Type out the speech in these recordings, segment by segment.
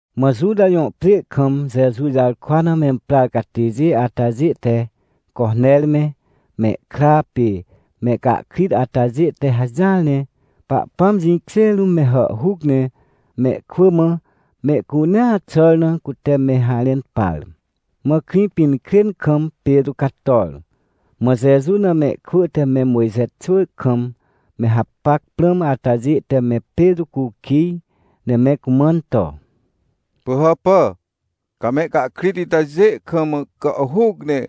Mã Juta jõ pjê kam Jeju jarkwa na memprar catêjê atajê te Coner me, mehkra pê mehcahkrit atajê te hajỹar ne Pahpãm jĩkjê rũm me hàhhuc ne mehkwỳ mã mehcunea xàr na cute me harẽn par. Mã Krĩpinkrên kam Petrô cator. Mã Jeju na mehkwỳ te me Mojxe xwỳ kam me hapac prãm atajê te me Petrô cukij, ne me cumãn to: — Pỳhàpà, ca mehcahkrit itajê kam gàhhuc ne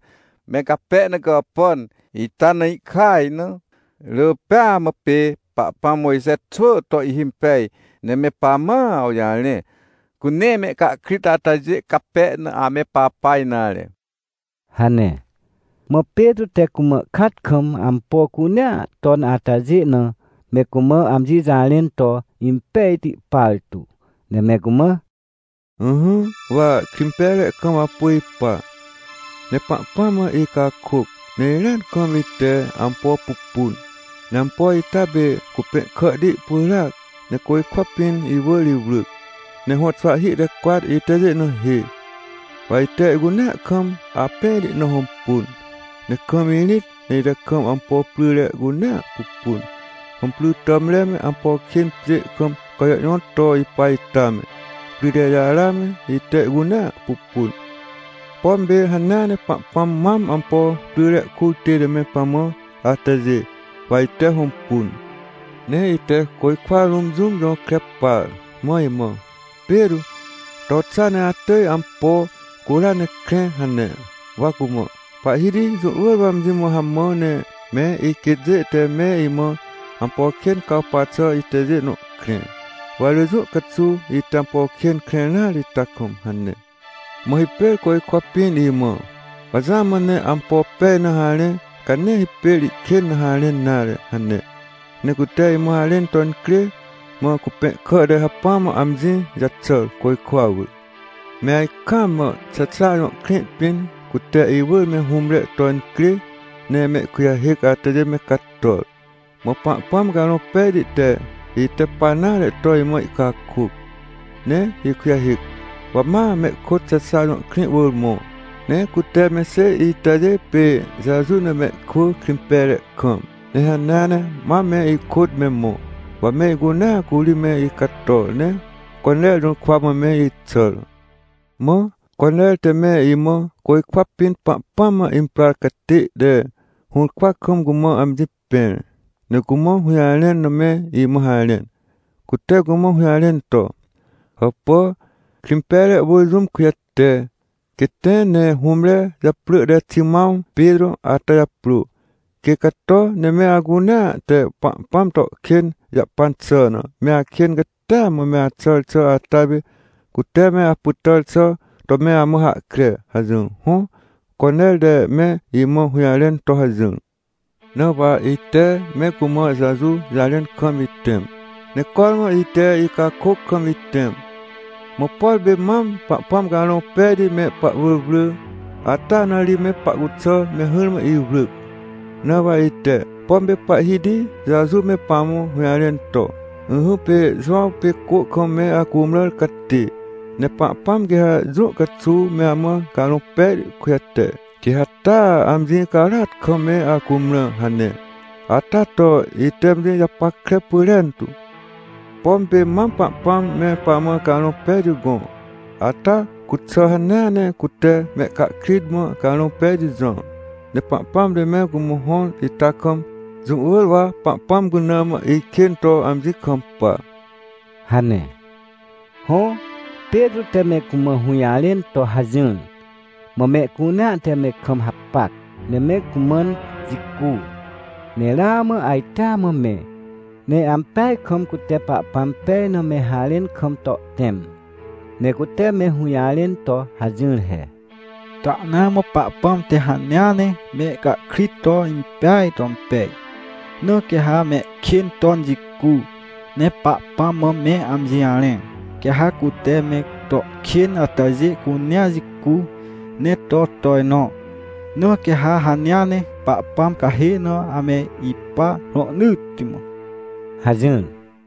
me cape na gàpàn, ita na ihkaj na! Rỳ pêa mã pê Pahpãm Mojxe xwỳ to ihhimpej, ne me pamã awjarẽ, cu nee mehcahkrit atajê cape na ame papa nare — hane. Mã Petrô te cumã kat kam ampo cunea ton atajê na, me cumã amji jarẽn to impejti partu, ne me cumã: — Ỹhỹ, wa Krĩmpejre kam apu ipa, ne Pahpãm mã icakôc, ne irĩat kam ite ampo pupun. Ne ampo ita pê cupẽhkàhti pyràac, ne côjkwa pĩn iwỳr iwrỳc. Ne hõxwahhi te cwat itajê na hê, wa ite ihcunea kam apẽhti na hõmpun. Ne kam irĩt, ne ite kam ampo pryre cunea pupun. Hõmpry tàmre me, ampo kên pjê kam cajõhjõt to ipa ita me, pryrejara me, ite ihcunea pupun. Pom pê hanea ne Pahpãm mam ampo pryre kur tête me pamã atajê, wa ite hõmpun. Ne ite côjkwa rũm jũm jõkre par, mã imã: “Petrô, to xa ne atỳj ampo cura ne krẽ” hane. — Wa cumã: “Pahhiti, jũ wỳr wa amji mã hamã ne me iquêtjê te me imã ampo kên cawpa xà itajê nõ krẽ. Wa rỳ jũ caxuw ite ampo kên krẽr nare ita kam” hane. — Mã hipêr côjkwa pĩn imã: “Wa jamã ne ampo pej na harẽ, ca nee hipêr ihkên na harẽn nare” hane. Ne cute imã harẽn to incrê, mã cupẽhkà te hacpỹa mã amji jaxàr, côjkwa wỳr. — Me ajkaam mã Xexa jõ krĩ pĩn, cute iwỳr me hũmre to incrê ne mehkujahêc atajê me cator. Mã Pahpãm Carõ Pejti te, ite pa nare to imã ihcakôc, ne ikujahêc, wa ma mehkôt Xexa jõ krĩ wỳr mõ. Ne cute me xêj itajê pê Jeju na mehkwỳ Krĩmpejre kam, ne hanea ne ma me ikôt me mõ. Wa me icunea curi me icator, ne Coner jũrkwa mã me ixàr. — Mã Coner te me imã côjkwa pĩn Pahpãm mã imprar catê te hũrkwa kam cumã amji pẽr, ne cumã hũjarẽn na me imã harẽn. Cute cumã hũjarẽn to: “Hàpà, Krĩmpejre wỳr jũm kujate, quê tẽ ne hũmre japrỳ te Ximãw Petrô atajaprô. Quê cato, ne me acunea te Pahpãm to kên jahpan xà na, me akên catia mã me axàr xà ata pê, cute me apytàr xà to me amã hahkre” hajỹr. Hõ, Coner te me imã hũjarẽn to hajỹr. — Na wa ite me cumã Jeju jarẽn kam itẽm. Ne cormã ite icakôc kam itẽm, mã por pê mam Pahpãm Carõ Pejti me pahwỳr wrỳ, ata na ri me pahcuxà me hỹrmã iwrỳc. Na wa ite, pom pê Pahhiti Jeju me pamã hũjarẽn to: “Ỹhỹ, pê Jowãw pê cô kam me acumrãr catê. Ne Pahpãm quê ha jũ caxuw me amã Carõ Pejti kujate, quê ha taa amji carôat kam me acumrã” hane ata to, ite amji japackre pyrentu. Pom pê mam Pahpãm me pamã Carõ Pejti gõ, ata cuxà hanea ne cute mehcahkrit mã Carõ Pejti jõr. Ne Pahpãm te me cumã hõr ita kam, jũ wỳr wa Pahpãm cuna mã ikên to amji kampa — hane. Hõ, Petrô te me cumã hũjarẽn to hajỹr, mã mehcunea te me kam hapac, ne me cumãn jicu, ne ramã ajtea mã me, ne ampeaj kam cute Pahpãm pej na me harẽn kam to ihtẽm. Ne cute me hũjarẽn to hajỹr he: — Tahnaa mã, Pahpãm te hanea ne mehcahkrit to impeaj to impej. Na quê ha mehkên ton jicu, ne Pahpãm mã me amji jarẽ, quê ha cute me to kên atajê cunea jicu ne to tojnõ. Na quê ha hanea ne Pahpãm cahê na ame ipa rohnỳtti mã — hajỹr.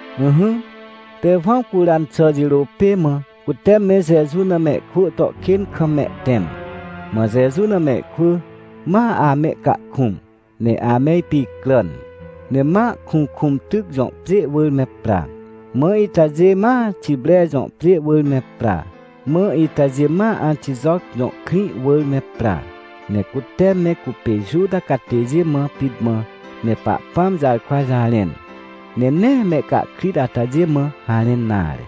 Ỹhỹ, Tewãw curan xà jirô pê mã cute me Jeju na mehkwỳ to kên kam mehtẽm. Mã Jeju na mehkwỳ ma amehcahkũm ne ame ipicràn. Ne ma Kuhkũmtyc jõ pjê wỳr me pra, mã itajê ma Xipre jõ pjê wỳr me pra, mã itajê ma Antijoc jõ krĩ wỳr me pra. Ne cute me cupê Juta catêjê mã pit mã me Pahpãm jarkwa jarẽn, ne nee mehcahkrit atajê mã harẽn nare.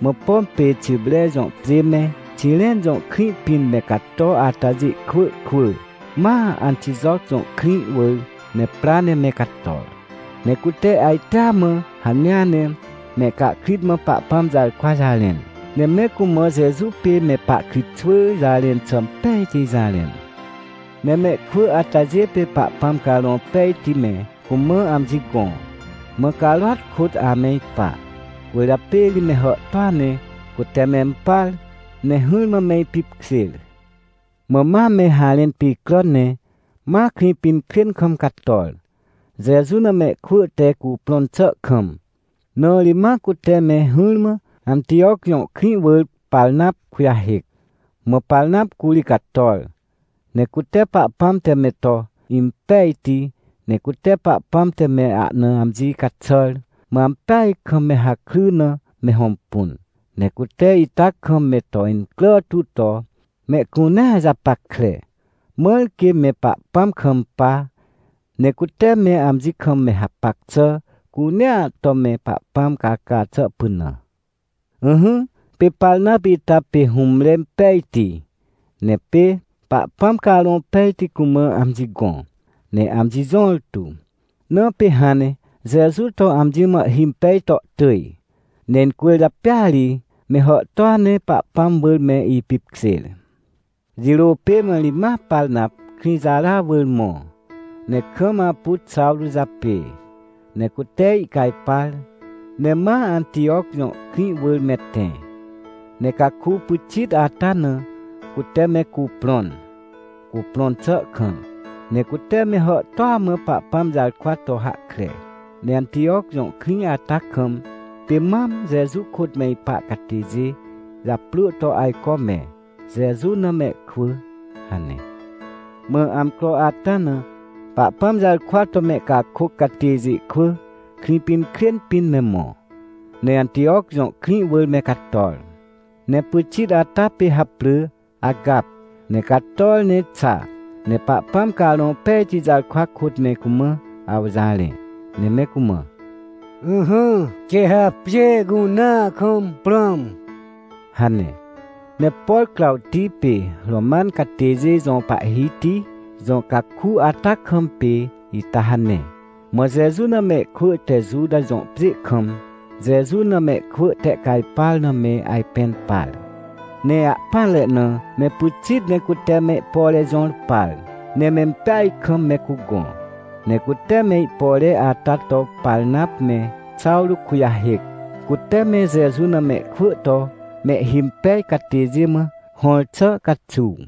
Mã pom pê Xipre jõ pjê me, Xiren jõ krĩ pĩn me cato atajê kwỳ kwỳ, ma Antijoc jõ krĩ wỳr me pra ne me cator. Ne cute ajtea mã hanea ne mehcahkrit mã Pahpãm jarkwa jarẽn, ne me cumã Jeju pê me pahkritxwỳ jarẽn xà impejti jarẽn. Ne mehkwỳ atajê pê Pahpãm Carõ Pejti me cumã amji gõ, mã carôat kôt ame ipa. Cwỳrjapê ri me hàhtôa ne cute mempar, ne hỹrmã me ipipkjêr. Mã ma me harẽn picràn, ne ma Krĩpinkrên kam cator, Jeju na mehkwỳ te cuprõn xà kam, na ri ma cute me hỹrmã, Antijoc jõ krĩ wỳr Parnap kujahêc. Mã Parnap curi cator, ne cute Pahpãm te me to impejti, ne cute Pahpãm te me ahna amji caxàr, mã ampeaj kam me hakry na me hõmpun. Ne cute ita kam me to incrà tu to mehcunea japackre, mãr quê me Pahpãm kampa, ne cute me amji kam me hapac xà cunea to me Pahpãm caca xà pynã. Ỹhỹ, pê Parnap ita pê hũmre impejti, ne pê Pahpãm Carõ Pejti cumã amji gõ ne amji jõrtu, na pê hãn ne Jeju to amji mã ihhimpej to tỳj. Ne incwỳrjapêa ri me hàhtôa ne Pahpãm wỳr me ipipkjêr. Jirô pê mã ri, ma Parnap Krĩjara wỳr mõ, ne kam apu Xawrô japê, ne cute ihcajpar, ne ma Antijoc jõ krĩ wỳr me tẽ. Ne caku pyxit ata na cute me cuprõn, cuprõn xà kam, ne cute me hàhtôa mã Pahpãm jarkwa to hahkre. Ne Antijoc jõ krĩ ata kam, pê mam Jeju kôt me ipa catêjê japrỳ to ajco me “Jeju na mehkwỳ” hane. Mã amcro ata na Pahpãm jarkwa to mehcakôc catêjê kwỳ Krĩpinkrên pĩn me mõ, ne Antijoc jõ krĩ wỳr me cator. Ne pyxit ata pê haprỳ Agap, ne cator ne xa ne Pahpãm Carõ Pejti jarkwa kôt me cumã awjarẽ, ne me cumã: — Ỹhỹ, quê ha pjê cunea kam prãm — hane. Ne por Crawti pê Roman catêjê jõ pahhiti jõ caku ata kam pê ita hane. Mã Jeju na mehkwỳ te Juta jõ pjê kam Jeju na mehkwỳ tehcajpar na me ajpẽn par. Ne ahpỹanre na, me pyxit ne cute me ihpore jõr par, ne mempeaj kam me cugõ. Ne cute me ihpore ata to Parnap me Xawrô kujahêc, cute me Jeju na mehkwỳ to mehhimpej catêjê mã hõr xà caxuw.